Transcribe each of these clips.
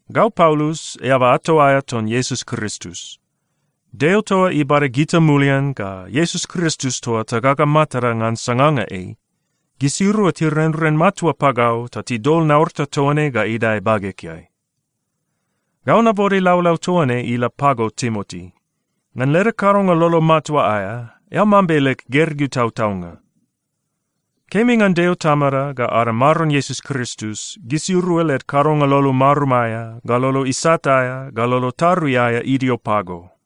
Gau Paulus, eaba ato aea ton Iesus Kristus. Deo toa ibada gita mulian ga Iesus Kristus toa tagaga matada ngan sanganga ei, gisirua tirenren matua pagau ta tidol naurata toa ne ga idae bagegeai. Gau nabode laulau toa ne ila pago Timoti. Ngan leda kadonga lolo matua aea, eao mambe leg gergeu tautaunga. Kemi ngan Deo Tamada ga ada Maron Iesus Kristus, gisirua led kadonga lolo marum aea, ga lolo isat aea, ga lolo tarui aea idio pago.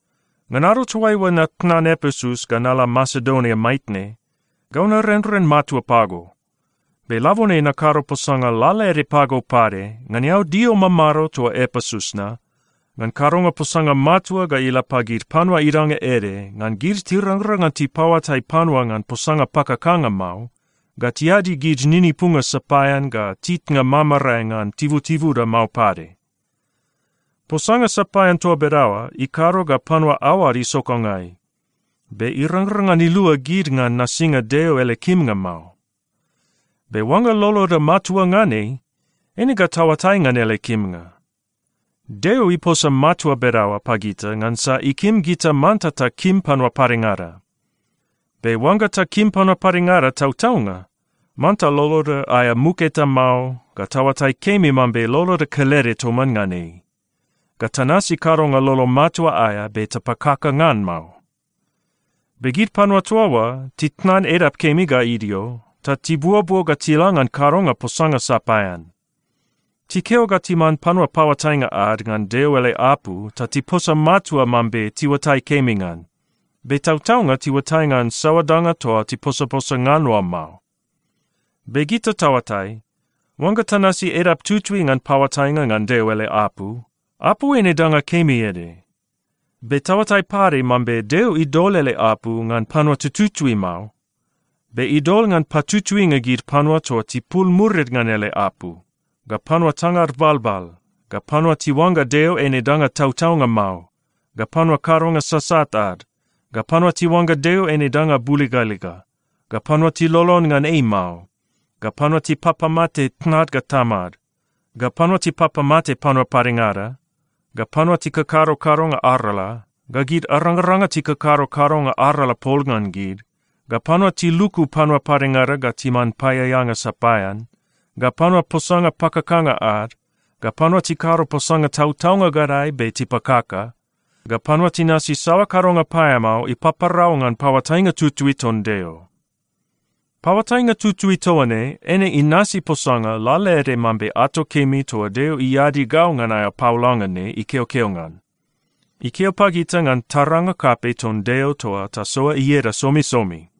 Ngan ado toaiua natnan Epesus ga nala Masedonia maitne, gau narenren matua pago. Be labone nakado posanga lalaede pago pade ngan eao dio mamado toa Epesus na ngan kadonga posanga matua ga ila pagid panua idanga ede, ngan gid tirangrang ngan tipaoatai panua ngan posanga pakakanga mao, ga tiadi gid ninipunga sapaean ga titnga mamarae ngan tibutibuda mao pade. Posanga sapaean toa bedaoa ikado ga panua aoad isokangai, be irangrang ngan ilua gid ngan nasinga Deo ele kimnga mao. Be oangga loloda matua ngan ei, eine ga taoatai ngan ele kimnga. Deo iposa matua bedaoa pagita ngansa ikim gita manta takim panua padengada. Be oangga takim panua padengada tautaunga, manta loloda aea muk eta mao, ga taoatai kemi mambe loloda kelede toman ngan ei, ga tanasi kadonga lolo matua aea be tapakaka ngan mao. Be gid panua toa oa titnan edap kemi ga idio, ta tibuobuo ga tila ngan kadonga posanga sapaean. Tikeo ga timan panua paoatainga ad ngan Deo ele apu ta tiposa matua mambe tiuatai kemi ngan, be tautaunga tiuatai ngan saoa danga toa tiposaposa ngan oa mao. Be gita taoatai, oangga tanasi edap tutui ngan paoatainga ngan Deo ele apu, apu eine danga kemi ede. Be taoatai pade mambe Deo idol ele apu ngan panua tututui mao, be idol ngan patutuinga gid panua toa tipul murid ngan ele apu, ga panua tangad balbal, ga panua tiuangga Deo eine danga tautaunga mao, ga panua kadonga sasat ad, ga panua tiuangga Deo eine danga buligaliga, ga panua tilolon ngan ei mao, ga panua tipapamate tnad ga tamad, ga panua tipapamate panua padengada, ga panua tikakado kadonga arala, ga gid arangaranga tikakado kadonga arala pol ngan gid, ga panua tiluku panua padengada ga timan paeaeanga sapaean, ga panua posanga pakakanga ad, ga panua tikado posanga tautaunga gadae be tipakaka, ga panua tinasi saoa kadonga paeamao ipaparau ngan paoatainga tutui ton Deo. Paoatainga tutui toa ne, eine inasi posanga lalaede mambe ato kemi toa Deo iadi gau ngan aea paolanga ne ikeokeo ngan. Ikeo pagita ngan taranga kapei ton Deo toa tasoa ieda somisomi.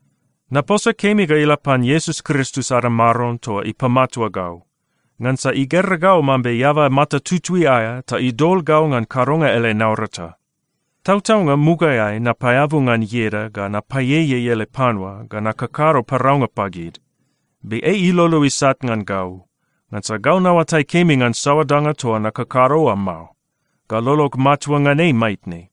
Naposa kemi ga ila pan Iesus Kristus ada Maron toa ipamatua gau, ngansa igera gau mambe eaba mata tutui aea ta idol gau ngan kadonga ele naurata. Tautaunga, mugaeai napaeabu ngan ieda ga napaieiei ele panua ga nakakado paraunga pagid. Be ei ilolo isat ngan gau, ngansa gau naoatai kemi ngan saoa danga toa nakakado oa mao, ga lolog matua ngan ei maitne.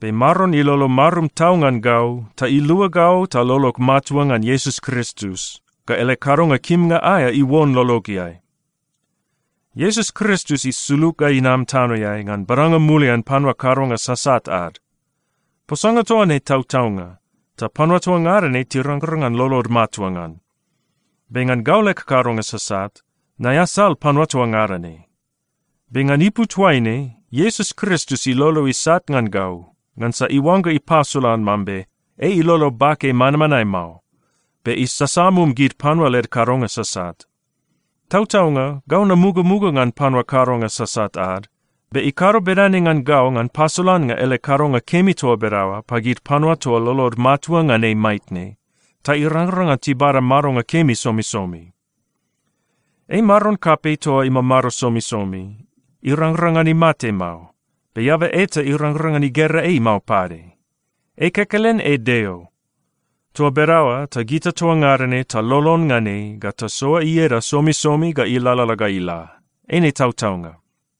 Be Maron ilolo marum tau ngan gau ta ilua gau ta lolog matua ngan Iesus Kristus, ga ele kadonga kimnga aea iuon lologeai. Iesus Kristus isulug ga inam tanoeai ngan badanga mulian panua kadonga sasat ad. Posanga toa ne tautaunga, ta panua toa ngada ne tirangrang ngan lolod matua ngan. Be ngan gau leg kadonga sasat, naeasal panua toa ngada ne. Be ngan ipu toaine Iesus Kristus ilolo isat ngan gau, ngansa iuangga ipasolan mambe ei ilolo bake manmanae mao, be isasamum gid panua led kadonga sasat. Tautaunga, gau namugamuga ngan panua kadonga sasat ad, be ikado bedane ngan gau ngan pasolannga ele kadonga kemi toa bedaoa pagid panua toa lolod matua ngan ei maitne, ta irangrang ngan tibada madonga kemi somisomi. Ei Maron kapei toa imamado somisomi. Irangrang ngan imate mao, be eaba eta irangrang ngan igera ei mao pade. Ei kekelen ei Deo. Toa bedaoa ta gita toa ngada ne talolon ngan ei ga tasoa ieda somisomi ga ilalala ga ila. Eine tautaunga.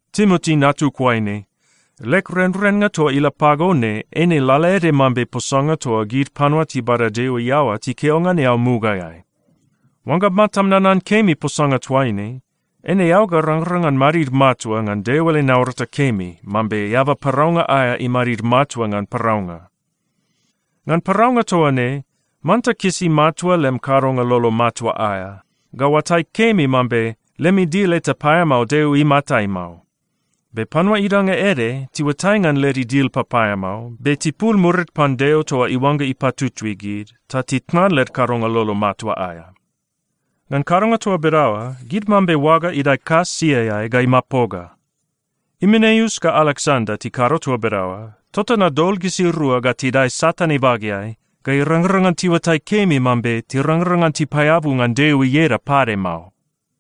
Timoti, natug oaine, leg renrennga toa ila pago ne eine lalaede mambe posanga toa gid panua tibada Deo iaoa tikeo ngan eao mugaeai. Oangga matam nanan kemi posanga toaine, eine eao ga rangrang ngan madid matua ngan Deo ele naurata kemi mambe eaba paraunga aea imadid matua ngan paraunga. Ngan paraunga toa ne, manta kisi matua lem kadonga lolo matua aea, ga oatai kemi mambe lem idil eta paeamao Deo imatai mao. Be panua idanga ede tiuatai ngan led idil papaeamao, be tipul murid pan Deo toa iuangga ipatutui gid, ta titnan led kadonga lolo matua aea. Ngan kadonga toa bedaoa, gid mambe oaga idae kas siaeai ga imapoga. Imeneus ga Aleksanda tikado toa bedaoa, tota nadol gisirua ga tidae Satan ibageai, ga irangrang ngan tiuatai kemi mambe tirangrang ngan tipaeabu ngan Deo ieda pade mao.